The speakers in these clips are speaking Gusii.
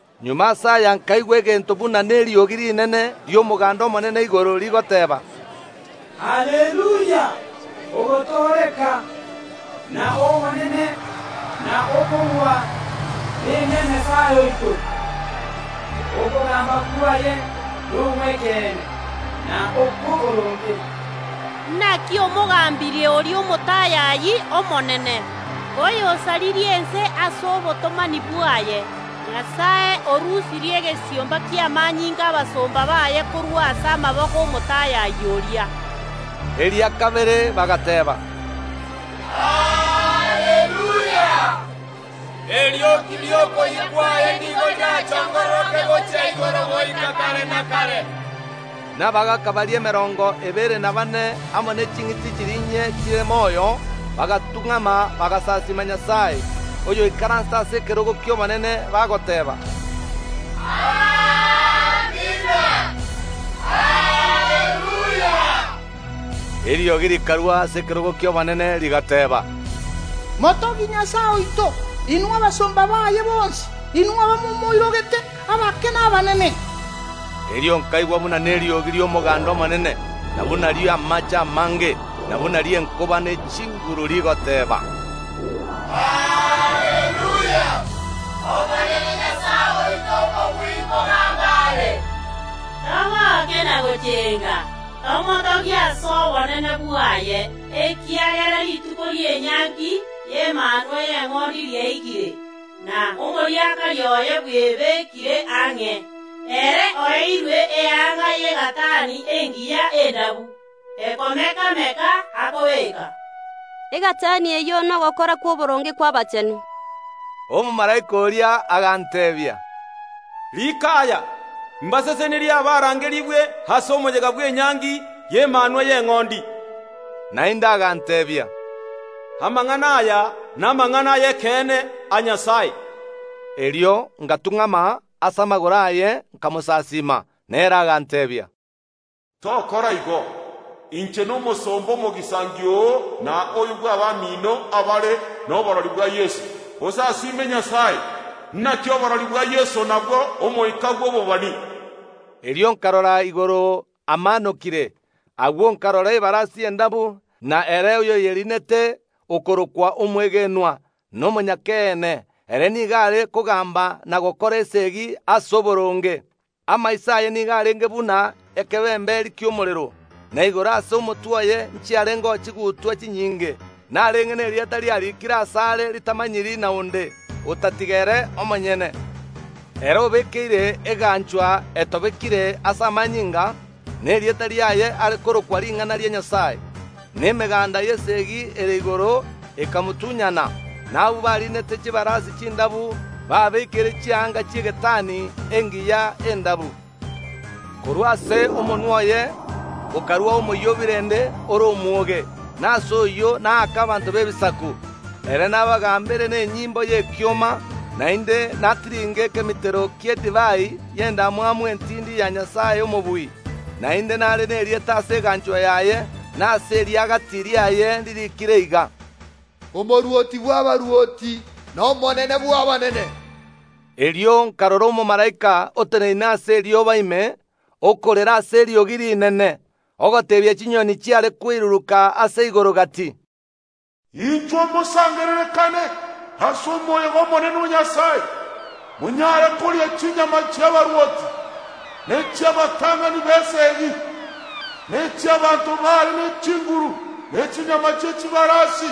Magega ase aya nkaigwa egento buna neriogi rinene ri’omoganda omonene igoro, rigoteeba, “Haleluya! Ogotooreka, na obonene, na okobua, nebia Nyasae oito. Okogamba kwaye nogw’ekeene, na okw’oboronge, naki omogambirie oria omotayayi omonene, oyosaririe ense ase obotomani bwaye. Nyasae orusirie egesiomba ki’amanyinga ’abasomba baye korwa ase amaboko ’omotayayi oria” Eria kabere bagateeba, “Haleluya! Erioki ri’okoyia kwaye nigo rirachongororoke gochia igoro goika kare na kare.” Na abagaaka baria emerongo ebere na baane amo ne ching’iti chiria inye chire moyo bagatung’ama, bagasasiima Nyasae oyoikaransete ase ekerogo ki’obonene, bagoteeba, “Amina. Haleluya!” Eriogi rikarua ase ekerogo ki’obonene rigateba, “Motogie Nyasae oito, inwe abasomba baye bonsi, inwe abamomoirogete, abake na abanene!” Erio nkaigwa buna neriogi ri’omoganda omonene, na buna eri’amaache amange, na buna eri’enkoba ye chinguru rigoteeba, “Haleluya! Omonene Nyasae Omobui nkogamba are. Togoke na gochenga, tomotogie ase obonene bwaye, ekiagera rituko ri’enyangi y’Emanwa y’Eng’ondi riaikire, na omoriakari oye bwebekire ang’e. Ere oeirwe eanga y’egatani engiya endabu, ekomeka‐meka, akobeeka.” Egatani eyio nogokora kw’oboronge kw’abachenu. Omomalaika oria aganteebia, “Riika aya: Mbasesenirie abarangerigwe ase omoyega bw’enyangi y’Emanwa y’Eng’ondi.” Naende aganteebia, “Amang’ana aya namang’ana ay’ekeene a Nyasae.” Erio ngatung’ama ase amagoro aye nkamosasiima. Na ere aganteebia, “Tokora igo! Inche nomosomba omogisangio oo na oyo bw’abamino abare noborori bwa Yeso. Osasiime Nyasae! Naki oborori bwa Yeso nabwo omoika bw’obobani.” Erio nkarora igoro amaanokire. Agwo nkarora ebarasi endabu, na ere oyoyeriinete okorokwa Omwegenwa na Omonyakeene; ere nigo are kogamba na gokora esegi ase oboronge. Amaiso aye nigo arenge buna ekebemberi ki’omorero, na igoro ase omotwe oye nchiarengeo chigutwa chinyinge. Narenge nerieta riarikire asare ritamanyiri na onde, otatiga ere omonyene. Ere obekeire eganchwa etobekire ase amanyinga, na erieta riaye are korokwa Ring’ana ria Nyasae. Na emeganda y’esegi ere igoro ekamotunyana, na abwo bariinete chibarasi chindabu, babeekeire chianga chi’egatani engiya endabu. Korwa ase omonwa oye okaruao omoyio o birende ore omwoge, na ase oyio naake abanto b’ebisaku. Ere nabagambere nenyimbo y’ekioma, naende natiringe ekemitero ki’edivai y’endamwamu entindi ya Nyasae Omobui. Naende nare nerieta ase eganchwa yaye na ase eriagati riaye ririikire iga: Omorwoti bw’abarwoti n’Omonene bw’abanene. Erio nkarora omomalaika oteneine ase erioba ime, okorera ase eriogi rinene, ogoteebia chinyoni chiare koiruruka ase igoro gati, “Inchuo mosangererekane ase omoyega omonene o Nyasae. Monyare koria chinyama chi’abarwoti, na echi’abatang’ani b’esegi, na echi’abaanto bare ne chinguru, ne chinyama chi’echibarasi,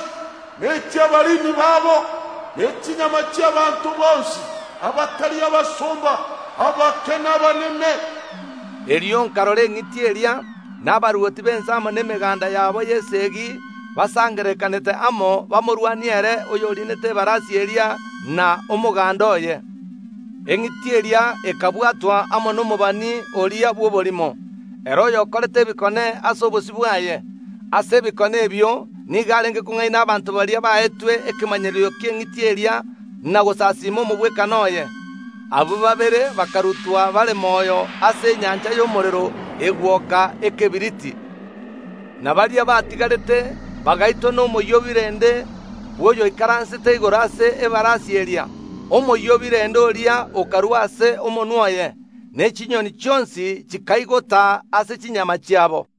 na echi’abariini babo, ne chinyama chi’abaanto bonsi, abatari abasomba, abake na abanene.” Erio nkarora eng’iti eria, na abarwoti b’ense amo nemeganda yabo y’esegi basangererekanete amo bamorwanie ere oyoriinete ebarasi eria na omoganda oye. Eng’iti eria ekabwatwa amo nomobani oria bw’oborimo, ere oyokorete ebikone ase obosio bwaye. Ase ebikone ebio nigo are kong’aina abanto baria baetwe ekemanyererio ki’engiti eria na gosasiima omogwekano oye. Abwo babere bakarutwa bare moyo ase enyancha y’omorero egwoka ekebiriti. Na baria batigarete bagaitwa nomoyio o birende bw’oyoikaransete igoro ase ebarasi eria, omoyio o birende, oria okorua ase omonwa oye. Ne chinyoni chionsi chikaigota ase chinyama chiabo.